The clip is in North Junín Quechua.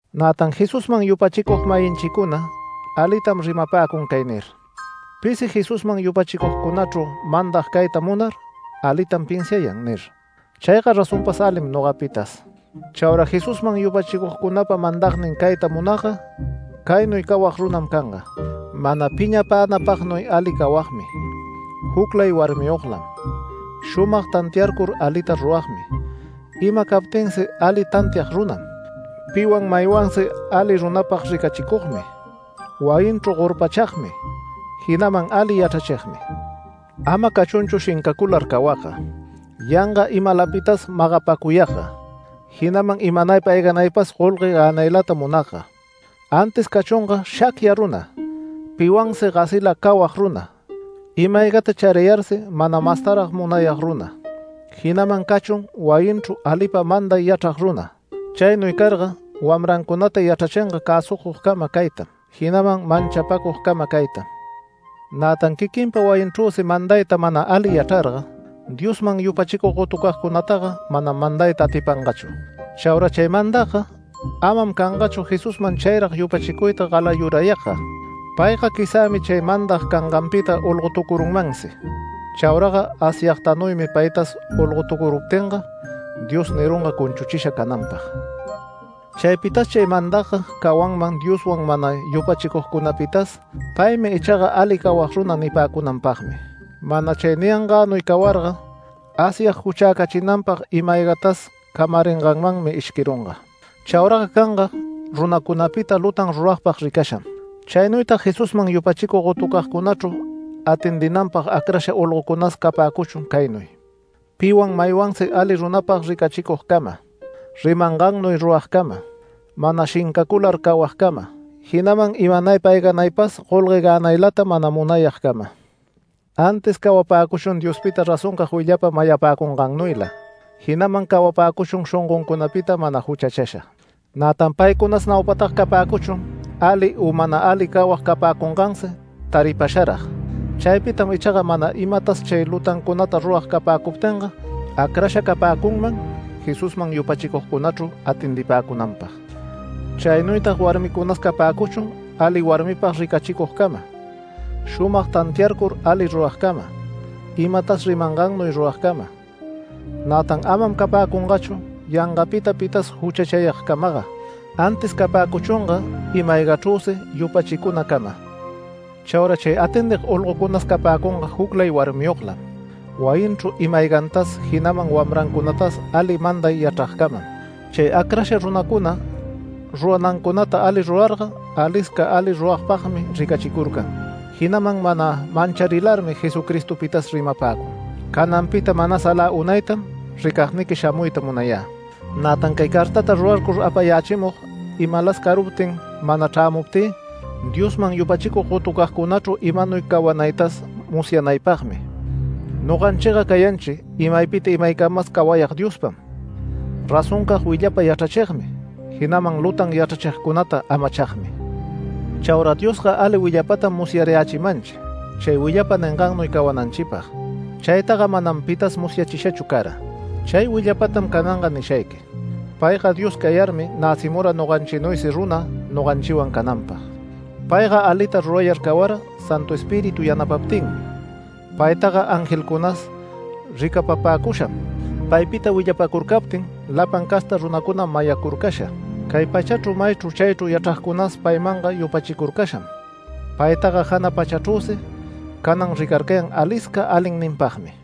Nätan Jesusman yupachicug-mayinchicuna alitam rimapäcun cay nir: “Pisi Jesusman yupachicugcunachru mandag cayta munar alitam pinsiayan” nir. Chayga razonpas alim nogapitas. Chaura Jesusman yupachicugcunapa mandagnin cayta munagga caynuy cawag runam canga: Mana piñapänapagnuy ali cawagmi, juclay warmiyoglam, shumag tantiarcur alita ruragmi, ima captinsi ali tantiag runam, piwan maymansi ali runapag ricachicugmi, wayinchru gorpachagmi, jinaman ali yachrachigmi. Ama cachunchu shincacular cawagga, yanga imalapitas magapacuyagga, jinaman imanaypa ayganaypas golgue gänaylata munagga, antis cachunga shacya runa, piwansi gasila cawag runa, ima-aygata charayarsi mana mastarag munayag runa. Jinaman cachun wayinchru alipa manday yachrag runa. Chaynuy carga wamrancunata yachrachinga cäsugcama caytam, jinaman manchapacugcama caytam. Nätan quiquinpa wayinchrüsi mandayta mana ali yachrarga, Diosman yupachicug gotucagcunataga manam mandayta atipangachu. Chaura chay mandagga amam cangachu Jesusman chayrag yupachicuyta galayurayagga. Payga quizämi chay mandag canganpita olgotucurunmansi. Chauraga Asyagtanuymi paytas olgotucuruptinga Dios nirunga cunchuchisha cananpag. Chaypitas chay mandagga cawanman Diosman mana yupachicugcunapitas “Paymi ichaga ali cawag runa” nipäcunanpagmi. Mana chay niyangänuy cawarga Asyag juchäcachinanpag ima-aygatas camaringanmanmi ishquirunga. Chauraga canga runacunapita lutan ruragpag ricasham. Chaynuytag Jesusman yupachicug gotucagcunachru atendinanpag acrasha olgocunas capäcuchun caynuy: Piwan maywansi ali runapag ricachicugcama, rimangannuy ruragcama, mana shincacular cawagcama, jinaman imanaypa ayganaypas golgue gänaylata mana munayagcama. Antis cawapäcuchun Diospita razoncag willapa mayapäcungannuyla, jinaman cawapäcuchun shongoncunapita mana juchachasha. Nätan paycunas naupataga capäcuchun ali u mana ali cawag capäcungansi taripasharag. Chaypitam ichaga mana imatas chay lutancunata rurag capäcuptinga, acrasha capäcunman Jesusman yupachicugcunachru atendipäcunanpag. Chaynuytag warmicunas capäcuchun ali warmipag ricachicugcama, shumag tantiarcur ali ruragcama, imatas rimangannuy ruragcama. Nätan amam capäcungachu yangapita pitas juchachayagcamaga, antis capäcuchunga ima-aygachrüsi yupachicunacama. Chaura chay atendig olgocunas capäcunga juclay warmiyoglam, wayinchru ima-aygantas, jinaman wamrancunatas ali manday yachragcamam. Chay acrasha runacuna ruranancunata ali rurarga alisca ali runapagmi ricachicurcan, jinaman mana mancharilarmi Jesucristopitas rimapäcun. Cananpita manas alä unaytam ricagniqui shamuyta munayä. Nätan cay cartata rurarcur apayächimug, imalas caruptin, mana chrämuptï, Diosman yupachicug gotucagcunachru imanuy cawanaytas musyanaypagmi. Noganchiga cayanchi imaypita imaycamas cawayag Diospam, razoncag willapa yachrachigmi, jinaman lutan yachrachigcunata amachagmi. Chaura Diosga ali willapatam musyarayächimanchi chay willapa ningannuy cawananchipag. Chaytaga manam pitas musyachishachu cara. Chay willapatam cananga nishayqui: Payga Dios cayarmi näcimura noganchinuysi runa noganchiwan cananpag. Payga alita rurayar cawara Santu Espíritu yanapaptinmi. Paytaga angelcunas ricapapäcusham. Paypita willapacurcaptin lapan casta runacunam mayacurcasha. Cay pachachru maychru chaychru yachragcunas paymanga yupachicurcasham. Paytaga jana pachachrüsi canan ricarcayan alisca alinninpagmi.